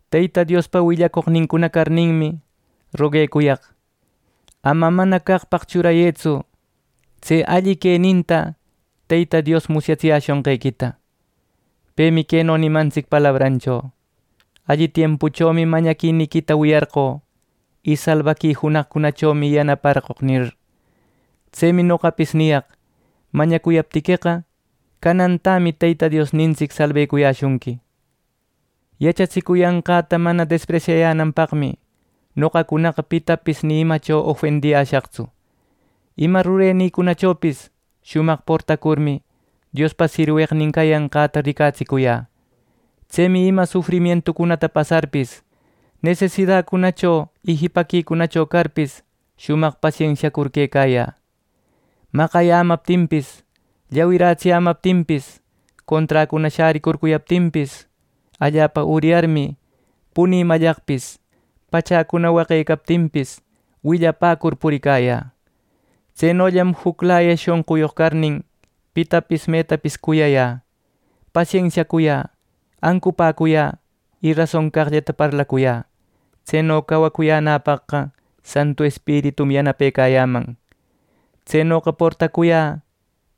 Teyta Diospa willacoqnincuna carninmi, roguecuyaq: Ama mana caqpaq churayëtsu tse alli queninta Teyta Dios musyätsiyäshunqequita. Pemi queno nimantsic palabrancho: “Alli tiempuchomi mañaquiniquita wiyarqoq, y salbaqui junaqcunachomi yanaparqoq” nir. Tsemi noqapis niriyaq: Mañacuyaptiqueqa, canantämi Teyta Diosnintsic salbecuyäshunqui. Yachatsicuyanqäta mana despresyayänanpaqmi noqacunaqa pitapis ni imacho ofendiyäshaqtsu. Ima rurenïcunachopis shumaq portacurmi, Diospa sirweqnin cayanqäta ricatsicuyä. Tsemi ima sufrimientucunata pasarpis, nesidacunacho y jipaquicunacho carpis, shumaq pasensiacur quecayä. Maqayämaptinpis llawirätsiyämaptinpis, conträcuna shäricurcuyaptinpis, allapa uryarmi, punï mallaqpis, pachäcuna waqecaptinpis, willapäcur puricayä. Tsenollam juclaya shonquyoq carnin, pitapis metapis cuyayä, pasensiacuyä, ancupäcuyä y rason caqllata parlacuyä. Tseno cawacuyänäpaqqa Santu Espiritum yanapecayäman. Tsenoqa portacuyä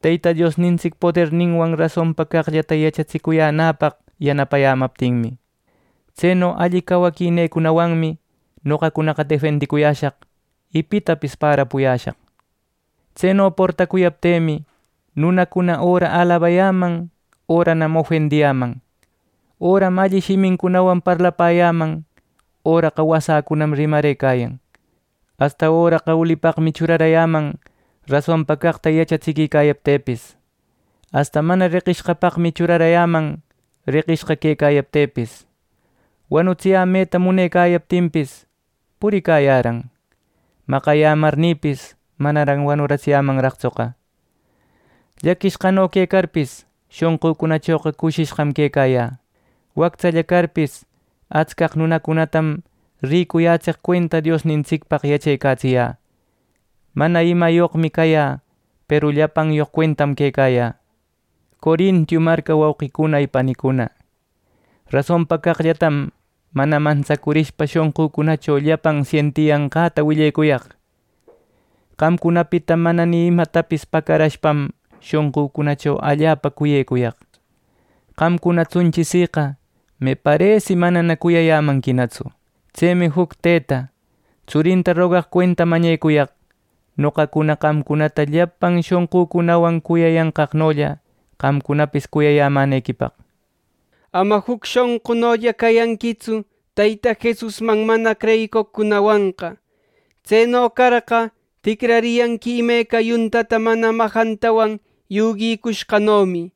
Teyta Diosnintsic poderninwan rasonpa caqllata yachatsicuyänäpaq yanapayämaptinmi. Tseno alli cawaquinïcunawanmi noqacunaqa defendicuyäshaq, y pitapis pärapuyäshaq. Tseno portacuyaptï me nunacuna öra alabarayäman öranam ofendiyäman. Öram alli shimincunawan parlapäyäman; öraqa wasäcunam rimarëcayan. Asta öraqa ulipaqmi churarayäman rasonpa caqta yachatsiquicayaptïpis. Asta mana reqishqapaqmi churarayäman reqishqa quecayaptïpis. Wanutsiyämeta munecayaptinpis puricayäran, maqayämarnïpis manaran wanuratsiyämanraqtsu. Llaquishqano quecarpis, shonqücunachoqa cushishqam quecayä, wactsalla carpis, atscaq nunacunatam ricuyätseq cuenta Diosnintsicpaq yachecatsiyä. Mana imäyoqmi cayä, peru llapanyoq cuentam quecayä. Corinto marca wauqicuna y panicuna, rasonpa caqllatam mana mantsacurishpa shonqücunacho llapan sientiyanqäta willecuyaq. Qamcunapita mana ni imatapis pacarashpam shonqücunacho allapa cuyecuyaq. Qamcunatsunchi siqa meparesi manana cuyayämanquinatsu Tsemi juc tëta tsurinta rogaq cuenta mañecuyaq noqacuna qamcunata llapan shonqücunawan cuyayanqaqnolla qamcunapis cuyayämänequipaq. Ama juc shonqunolla cayanquitsu Teyta Jesusman mana creyicoqcunawanqa. Tseno carqa, ticrariyanqui imeca yuntata mana majantawan yuguicushqanomi.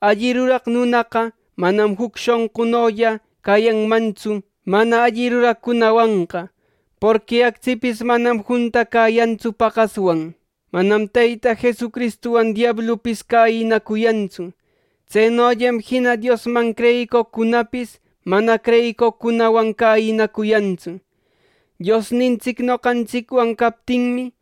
Alli ruraq nunaqa manam juc shonqunolla cayanmantsu, mana alli ruraqcunawanqa, porqui actsipis manam juntacäyantsu paqaswan. Manam Teyta Jesucristuwan diablupis cäyinacuyantsu; tsenollam jina Diosman creyicoqcunapis mana creyicoqcunawan cäyinacuyantsu. Diosnintsic noqantsicwan captinmi,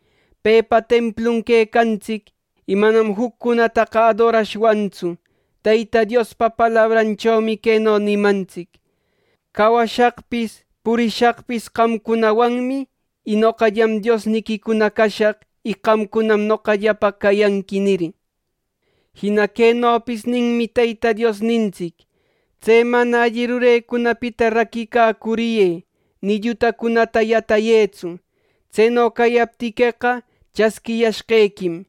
pepa templun quecantsic, y manam juccunataqa adorashwantsu. Teyta Diospa palabranchomi queno nimantsic: “Cawashaqpis, purishaqpis qamcunawanmi. Y noqallam Diosniquicuna cashaq. Y qamcunam noqallapaq cayanqui” nir. Jina quenopis ninmi Teyta Diosnintsic: “Tse mana alli rurenincunapita raquicacuriyë, ni llutancunata yatayëtsu. Tseno cayaptiqueqa chasquiyashqequim.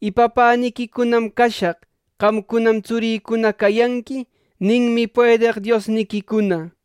Y Papäniquicunam cashaq; qamcunanam tsurïcuna cayanqui.” ninmi puedeq Diosniquicuna.